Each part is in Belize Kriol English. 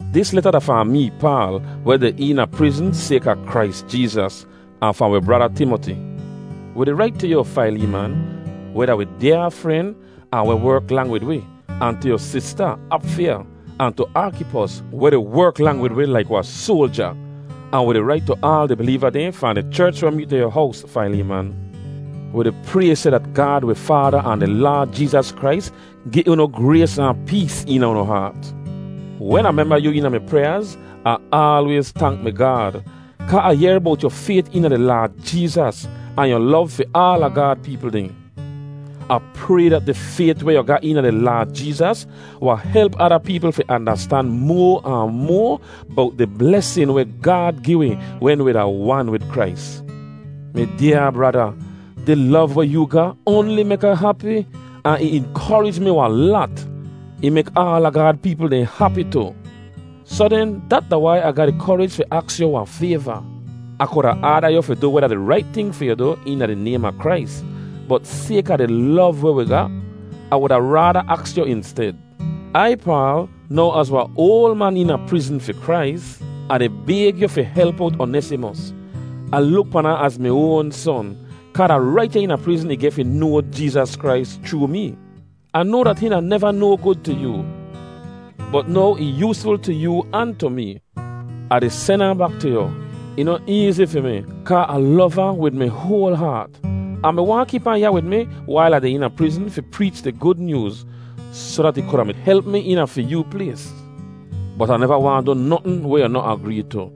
Dis leta da fahn mee, Paal, weh deh eena prizn sayka Krais Jeezas, ahn fahn wi brada Timoti. Wi di rait tu yu, Faileeman, weh da wi dyaa fren ahn weh werk lang wid wi, ahn tu wi sista Apfiya, ahn tu Arkipos, weh di werk lang wid wi laik wahn soalja. Ahn wi di rait tu aal di bileeva dehn fahn di cherch weh meet da yu hows, Faileeman. Wi di pray seh dat Gaad wi Faada ahn di Laad Jeezas Krais gi unu grays ahn pees eena unu haat. Wen Ah memba yu eena mi pryaaz, Ah aalwayz tank mi Gaad, kaa Ah yehr bowt yu fayt eena di Laad Jeezas ahn yu lov fi aala Gaad peepl dehn. Ah pray dat di fayt weh yu ga eena di Laad Jeezas wahn help ada peepl fi andastan moa ahn moa bowt di blesin weh Gaad gi wi wen wi da wan wid Krais. Mi dyaa brada, di lov weh yoo ga oanli mek Ah hapi, ahn ih inkorij mi wahn lat. Ih mek aala Gaad peepl dehn hapi tu. Soh den, dat da wai Ah ga di korij fi aks yu wahn fayva. Ah kuda aada yu fi du weh da di rait ting fi yu du eena di naym a Krais, bot sayka di lov weh wi ga, Ah wuda raada aks yu insted. Ai, Paal, now az wahn oal man eena prizn fi Krais, Ah di bayg yu fi help owt Onesimos. Ah luk pan ahn az mi oan son, kaa da rait ya eena prizn ih geh fi noa Jeezas Krais chroo mee. Ah noa dat hihn da neva no gud tu yoo, bot now ih yoosful tu yoo ahn tu mee. Ah di sen ahn bak tu yu. Ih noh eezi fi mi, kaa Ah lov ahn wid mi hoal haat. Ah mi waahn kip ahn ya wid mi wail Ah deh eena prizn fi preech di Gud Nyooz, soh dat ih kuda mi help mi eena fi yoo plays. Bot Ah neva waahn du notn weh yu noh agree tu.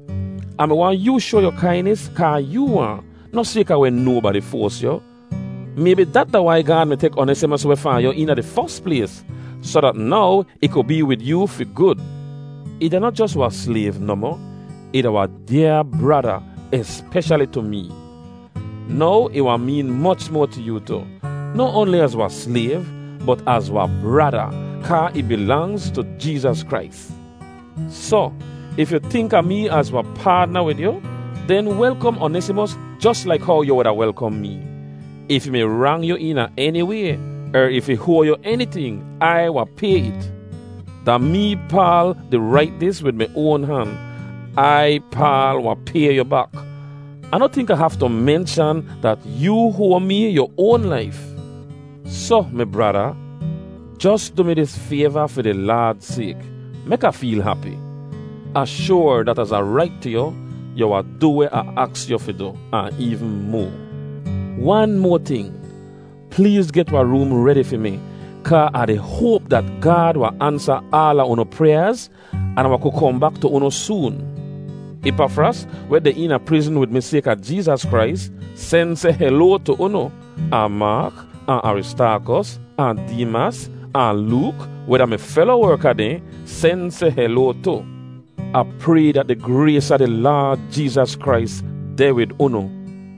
Ah mi waahn yoo shoa yu kainis kaa yoo waahn, noh sayka weh nobadi foas yu. Maybi dat da wai Gaad mi tek Onesimos weh fahn yu eena di fos plays, soh dat now ih ku bee wid yoo fi gud. Ih da noh jos wahn slayv nohmoh; ih da wahn dyaa brada, espeshali tu mee. Now ih wahn meen moch moa tu yoo tu, noh oanli az wahn slayv, bot az wahn brada, kaa ih bilangz tu Jeezas Krais. Soh, if yu tink a mee az wahn paadna wid yu, den welkom Onesimos jos laik how yu wuda welkom mee. If ih mi rang yu eena eni way, er if ih hoa yu eniting, Ai wahn pay it. Da mee, Paal, di rait dis wid mi oan han. Ai, Paal, wahn pay yu bak. Ah noh tink Ah haftu menshan dat yoo hoa mee yu oan laif. Soh, mi brada, jos du mi dis fayva fi di Laad sayk. Mek Ah feel hapi. Ah shoar dat az Ah rait tu yu, yu wahn du weh Ah aks yu fi du, ahn eevn moa. Wan moa ting, pleez get wahn room redi fi mi, kaa Ah di hoap dat Gaad wahn ansa aala unu pryaaz an Ah wahn ku kohn bak tu unu soon. Ipafras, weh deh eena prizn wid mi sayka Jeezas Krais, sen seh heloa tu unu, ahn Maak, ahn Aristaakos, ahn Deemas, ahn Look, weh da mi felo werka dehn, sen seh heloa tu. Ah pray dat di grays a di Laad Jeezas Krais deh wid unu.